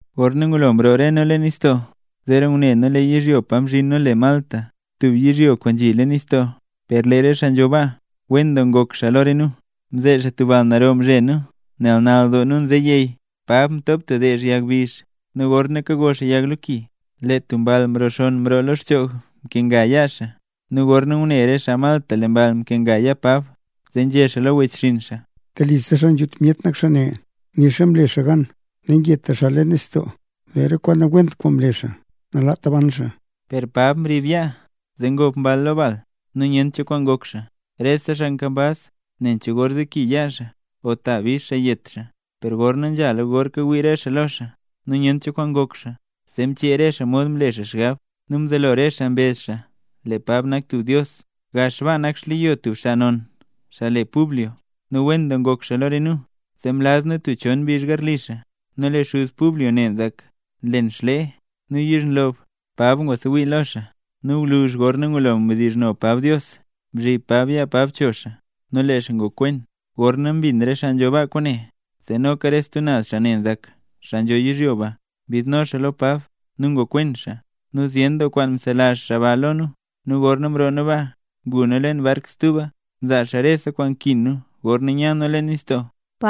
Gorna ngulo mroo re nu leen nistoo, zeera ngune nu lee yizhyo pa mzhin nu le Malta, tub yizhyo kwaan nzhi leen nistoo. Per lee re xaa nzho baa, wen doo ngok xaa lo re nu. Mze xaa tub bal naro mzhe nu nel nal doo nu nze yey. Pab mtop tub deezh yag bizh, nu gorna kago xaa yag lo ki, lee tub mball mxonn mroo lo xchoog mkenga yaa Pab. Nu gorna ngune re xaa Malta lee mball mkenga yaa Pab, zee nzhé xaa lo wechxinn xaa: —Telisa xaa nzhut myet nak xaa ne, nixa mle xaa gan nangeta xaa leen nistoo, per lee re kwaan nawent kwaan mle xaa nalaat ban xaa. Per Pab mrib yaa, zee ngob mball lo bal, nu nyent cho kwaan ngok xaa. Rese xaa nkambaz, nen cho gor zeki yaa xaa o ta bix xaa yet xaa. Per gor nzhala gor kawii re xaa lo xaa, nu nyent cho kwaan ngok xaa, zee mchee re xaa mod mle xaa xgab, nu mzelo re xaa mbezh lee Pab nak tub dios. Gax baa nzhi re xleyo cheen tub xaa non. Xaa ne le Publio nu wen doo ngok xaa lo re nu, zee mlaz nu tub chon mbizh garli xaa. Nu lee xuz Publio ne nzak; nlen xlee nu yizhnlob. Pab ngwasewii lo xaa, nu gwluzh gorna ngulo mdizhno Pab Dios, mzhib Pab yaa Pab cho xaa nu lee xaa ngokwen. Gorna mbin re xaa nzho baa kwaane, zee noka re stub naz xaa ne nzak, xaa nzho yizhyo ba, mbidno xaa lo Pab, nu ngokwen xaa. Nu zyen doo kwaan mzelazh xaa ba lo nu. Nu gorna mroo nu baa, ngu nu leen bark stuba, mzaa xaa rese kwaan nkin nu gorna nya nu leen nistoo.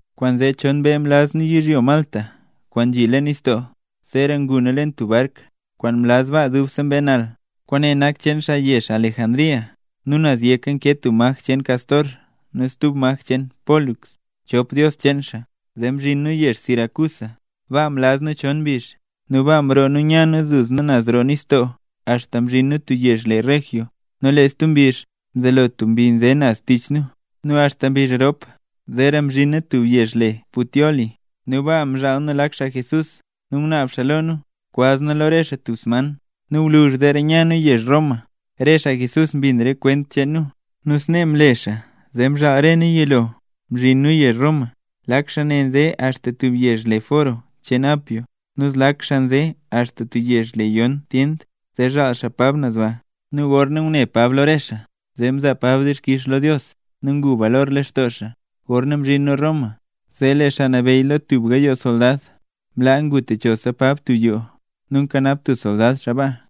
Kwaanzee chon mbee mlaz nu yizhyo Malta kwaan nzhi leen nistoo. Zeera ngu nu leen tub bark, kwaan mlaz baa dubse mbee nal; kwaane nak cheen xaa yezh Alejandría, nu naz yek nkee tub maj cheen Cástor nu stub maj cheen Pólux, chop dios cheen xaa. Zee mzhin nu yezh Siracusa, baa mlaz nu chon mbizh. Nu baa mroo nu nya nu duzna naz roo nistoo axta mzhin nu tub yezh le Regio. Nu lee stub mbizh, mzelo tub mbi nze naz tich nu. Nu axta mbizh rop zeera mzhin nu tub yezh le Puteoli. Nu baa mzhaal nu lak xaa Jesús nu ngunaab xaa lo nu kwaz nu lo re xaa tub sman. Nu gwluzh zeera nya nu yezh Roma. Re xaa Jesús mbin re kwent cheen nu. Nu snee mle xaa zee mzhaal re nu yilo mzhin nu yezh Roma. Lak xaa ne nze axta tub yezh le Foro cheen Apio, nu zlak xaa nze axta tub yezh le Yon Tyend zee zhaal xaa Pab naz ba. Nu gorna ngune Pab lo re xaa mzaa Pab dixkix lo Dios nu ngu balor lextoo xaa. Gorna mzhin nu Roma, zee lee xaa nabeyy lo tub gayoo soldad mlaa ngu techosa Pab tub yoo, nu nkanap tub soldad xaa baa.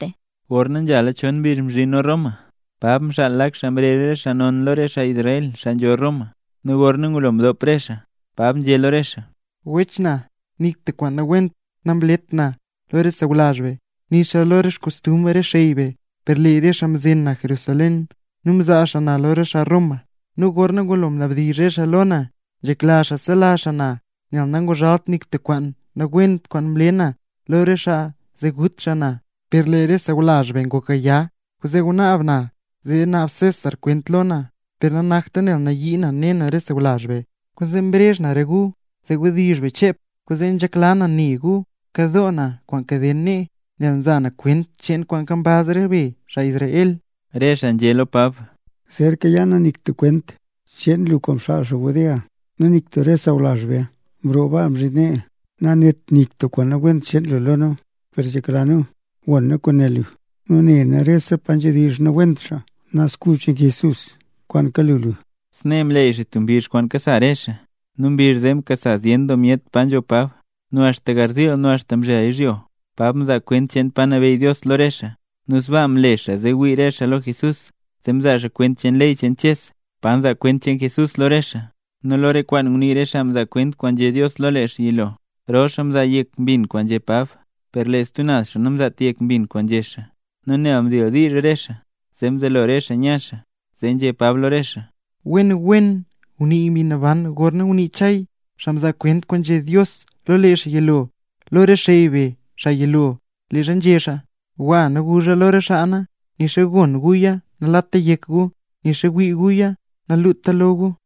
Gorna nzhala chon mbizh mzhin nu Roma, Pab mxaal lak xaa mrezh re xaa non lo re xaa Israel, xaa nzho Roma. Nu gorna ngulo mdop re xaa, Pab nzhé lo re xaa: —Wech na, nik tub kwaan nawent namlet na lo re sawlazh be, nixa lo re xkostumbr re xey be, per lee re xaa mzen na Jerusalén, nu mzaa xaa na lo re xaa Roma. Nu gorna ngulo mnabdizh re xaa lo na, nzhekla xaa sela xaa na, nel nanguzhalt xaa nik tub kwaan nawent kwaan mle na lo re xaa, zee gut xaa na. Per lee re sawlazh be ngok gaya, kwaanzee mnaab na zee César naab kwent lo na, per nanakta nel nayii na ne na re sawlazh be. Kwaanzee mrezh na re gu zee wdizh be chep. Kwaanzee nzhekla na ne gu, nkadoo na kwaan kaden nee, nel nza na kwent cheen kwaan nkambaz re be, xaa Israel. Re xaa nzhé lo Pab: —Zer kayaa nu nik tub kwent cheen lu kwaan mxaal xaa Judea, nu nik tub re sawlazh be mroo baa mzhin nee, nanét nik tub kwaan nawent cheen lu lo nu. Per nzhekla nu gon nu kwaan né lu, nel ne nu rese pa nzhedizh nawent xaa Naz Kub cheen Jesús kwaan kalu lu. Snee mleey xaa tub mbizh kwaan kasa re xaa. Nu mbizh zee mkasa zyen doo myet pa nzho Pab. Nu axta garziil nu axta mzhel yizhyo, Pab mzaa kwent cheen pa nabeyy Dios lo re xaa. Nu sbaa mle xaa zee wii re xaa lo Jesús, zee mzaa xaa kwent cheen ley cheen Ches, pa nzaa kwent cheen Jesús lo re xaa, nu lo re kwaan ngunii re xaa mzaa kwent kwaan nzhé Dios lo lee xaa yilo. Rol xaa mzaa yek mbin kwaan nzhé Pab, per lee stub naz xaa namzaat yek mbin kwaan nzhé xaa. Nu nel mdildiizh re xaa, mzelo xaa nya xaa. Zee nzhé Pab lo re xaa: —Wen wen ngunii Mbi Naban gorna ngunii Chay, xaa mzaa kwent kwaan nzhé Dios lo lee xaa yilo, lo re xey be xaa yilo, leezha nzhé xaa: Gwa nu guzh lo re xaa na: Nixa gon guya, nalata yek gu, nixa wii guya, naluta lo gu.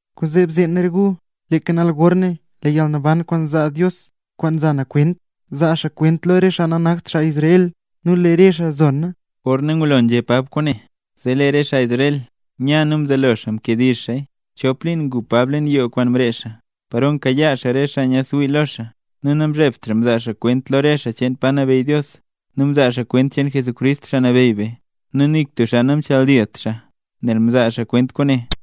’Kwaanzee bzeen re gu, leeka nal gorne, lee yalnaban kwaan nzaa Dios, kwaan nza na kwent, zaa xaa kwent lo re xaa nanakt xaa Israel, nu lee re xaa zee, zona. Gorna ngulo nzhé Pab kwaane, zee lee re xaa Israel nya nu mzelo xaa mkediizh xaaya. Chop liin ngu Pab leen yoo kwaan mree xaa, paro nkayaa xaa re xaa nyaadsewii lo xaa. Nu namzhebt xaa mzaa xaa kwent lo re xaa cheen pa nabeyy Dios, nu mzaa xaa kwent cheen Jesucrist, Xaa Nabeyy be, nu nik tub xaa namchadilt xaa, nel kazaa xaa kwent kwaane.